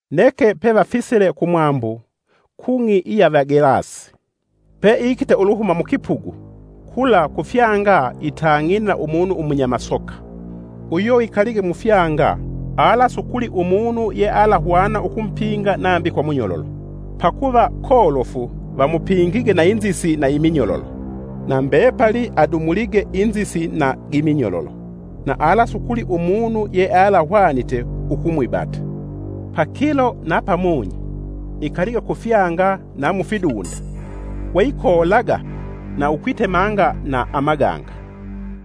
Neke pevafisile kumwambu, kung'i iya Vagelasi. Peikite uluhuma mukipugu, kula kufyanga itang'ine na umunu umunyamasoka. Uyo ikalige mufyanga alasukuli umunu yealahwana ukumupinga nambi kwa munyololo. Pakuva kolofu vamupingige na inzisi na iminyololo, na mbepali adumulige inzisi na giminyololo na alasukuli umunu yealahwanite ukumwibata. Pakilo na pamunyi ikalige kufyanga na mufidunda we ikoolaga na ukwitemanga na amaganga.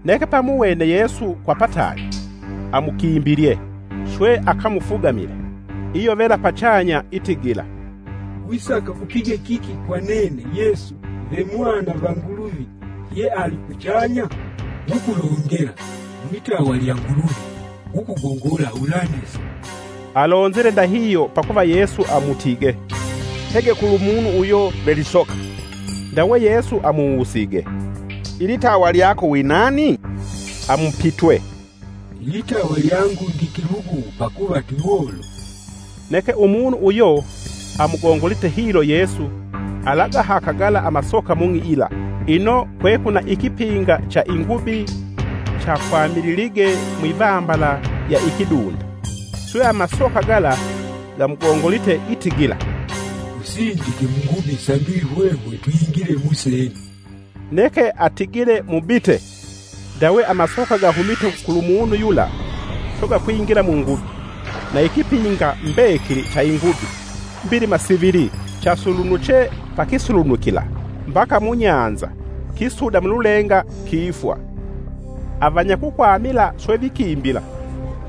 Neke peamuwene Yesu kwa pataali, amukimbilye, swe akamufugamile. Iyovela pachanya itigila, “Wisaka upige kiki kwa nene, Yesu ve Mwana va Nguluvi yealikuchanya? Ngukulongela mwitawa lya Nguluvi ngukugongola ulanesa!” (Alonzile ndahihyo pakuva Yesu amutige, “Hege kulu Munu uyo ve lisoka.”) Ndawe Yesu amuwusige, “Ilitawa lyako winani?” amupitwe, “Ilitawa lyangu ndi kilugu pakuva twiwolofu.” Neke umunu uyo amugongolite hilo Yesu alagahaka gala amasoka mung'i yila. Ino, kwekwina ikipinga cha ingubi chakwamililige mwivambala lya ikidunda. Swe amasoka gala gamugongolite gitigila, “Tusindike mungubi sambi hwehwe twingile musene.” Neke atigile mubite. Ndawe amasoka gahumite kulumunu yula, swe gakwingila mungubi. Na ikipinga mbekili cha ingubi mbilima sivili chasulunuche pa kisulunukila mbaka mu nyanza kisuda mululenga kifwa. Avanyakukwamila swe vikimbila,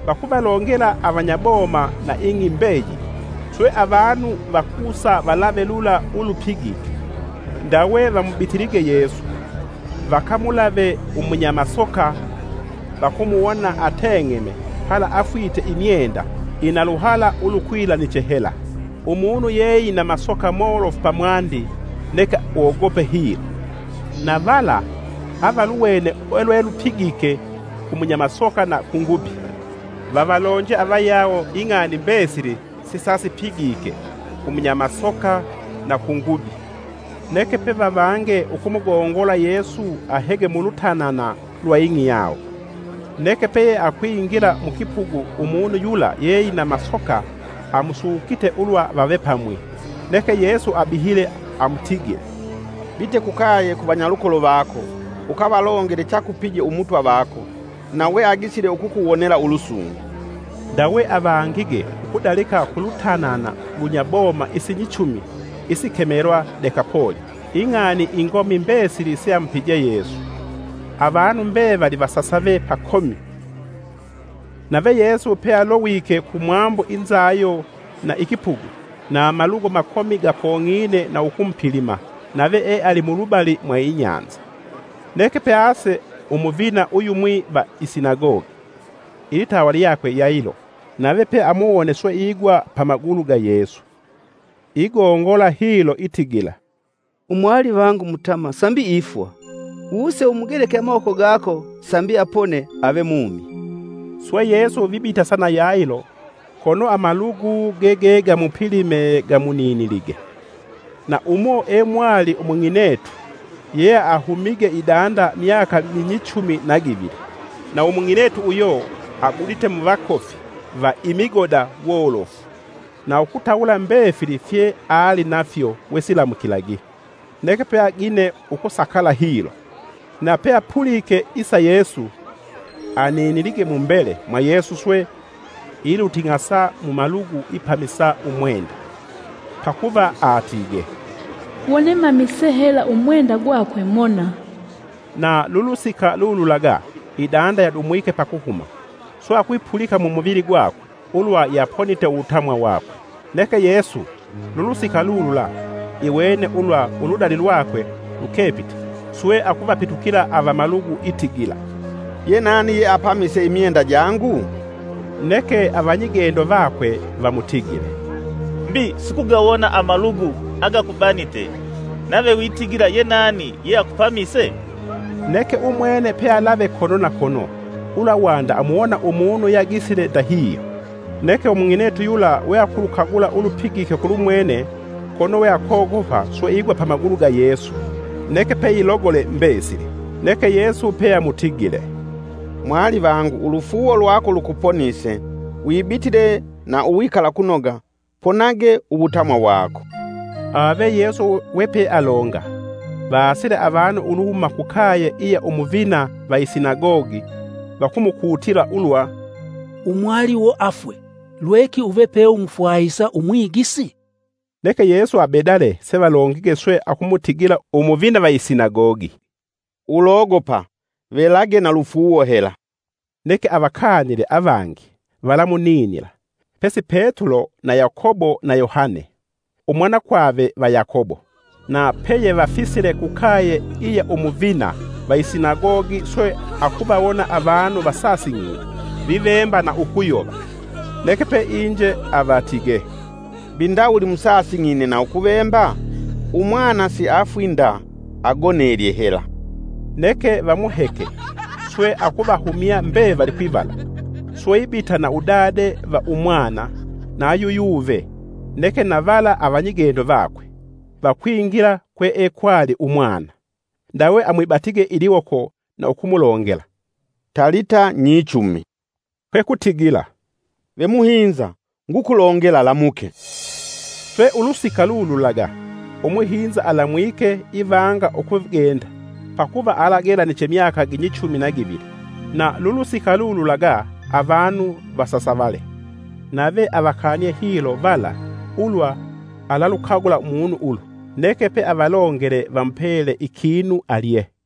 vakuvalongela avanyaboma na ing'i mbeyili. Swe avanu vakusa valave lula ulupigike. Ndawe vamubitilige Yesu, vakamulave umunyamasoka vakumuwona ateng'eme pala afwite imyenda ina luhala ulukwilaniche hela, umunu yeeina masoka molofu pamwandi neke wogope hilo. Na vala avaluwene ulwelupigike, ku munyamasoka na kungubi vavalonje avayawo ing'ani mbesili sesapigike ku munyamasoka na kungubi. Neke pevavange ukumugongola Yesu ahege mulutanana lwa ing'i yawo. Neke peyeakwingila mukipugu umunu yula yeeina amasoka amusukite ulwa vave pamwi. Neke Yesu abihile amutigile, “Bite kukaye ku vanyalukolo vako, ukavalongele chakupije umutwa vako, na weagisile ukukuwonela ulusungu.” Ndawe avangige ukudalika kulutanana ulunyaboma isinyichumi isikemelwa Dekapoli ing'ani ingomi mbesili seamupije Yesu; avanu mbevali vasasave pakomi. Nave Yesu pealowike kumwambu inzayo na ikipugu. Na amalugu makomi gakong'ine na ukumupilima, nave ealimulubali mwa inyanza. Neke pease umuvina uyumwi va isinagogi ilitawa lyakwe Yailo; nave peamuwone swe e igwa pamagulu ga Yesu. Igongola hilo itigila, “Umwalivangu mutamwa sambi ifwa, wuse umugeleke amawoko gako, sambi apone ave mumi.” Swe Yesu vibitasa na Yailo kono amalugu gegegamupilime gamuninilige. Na umo emwali umung'inetu yeahumige idanda myaka minyichumi na givili. Na umung'inetu uyo agudite muvakofi va imigoda wolofu na ukutawula mbefili fye alinafyo wesiilamukilagi neke peagine ukusakala hilo. Na peapulike isa Yesu, aninilige mumbele mwa Yesu swe iluting'asa mumalugu ipamisa umwenda. Pakuva atige, “Wone mamise hela umwenda gwakwe mona.” Na lulusika lululaga idanda yadumwike pakuhuma swe akwipulika mumuvili gwakwe ulwa yaponite uwutamwa wakwe. Neke Yesu, lulusika lulula iwene ulwa uludali lwakwe lukepite, swe akuvapitukila avamalugu itigila, “Ye nani yeapamise imyenda jangu?” Neke avanyigendo vakwe vamutigile, “Mbi sukugawona amalugu agakubanite, nave witigila ye nani yeakupamise?” Neke umwene pealave kono na kono ulwa wanda amuwona umunu yeagisile ndahihyo. Neke umung'inetu yula weakulukagula ulupigike kulumwene kono we akogopa swe igwa pamagulu ga Yesu neke peilogole mbesili. Neke Yesu peamutigile, “Mwalivangu ulufuuwo lwako lukuponise. Wibitile na uwikalakunoga, ponage uwutamwa wako.” Ave Yesu wepealonga, vaasile avanu uluhuma kukaye iya Umuvina va isinagogi vakumukutila ulwa, “Umwaliwo afwe. Lweki uve peumufwahisa Umwigisi?” Neke Yesu abedale sevalongige swe akumutigila Umuvina va isinagogi, “Ulogopa, velage na lufuuwo hela.” Neke avakanile avangi valamuninila, pesi Petulo na Yakobo na Yohane umwanakwave va Yakobo. Na peyevafisile kukaye iya umuvina va isinagogi swe akuvawona avanu vasasing'ine vivemba na ukuyova. Neke peinje avatige, “Mbi ndawuli musasing'ine na ukuvemba? Umwana siafwi nda agonelye hela.” Neke vamuheke swe akuvahumya mbevali kwivala, swe ibita na udade va Umwana na yu Yuve neke na vala avanyigendo vakwe vakwingila kwe ekwali umwana. Ndawe amwibatige iliwoko na ukumulongela, “Talita nyichumi,” kwe kutigila, “Ve muhinza, ngukulongela lamuke.” Swe ulusika lululaga umuhinza alamwike ivanga ukugenda. (Pakuva alagelaniche myaka ginyichumi na givili.) Na lulusika lululaga avanu vasasavale. Nave avakanie hilo vala, ulwa alalukagula munu ulu, neke peavalongele vamupele ikinu alye.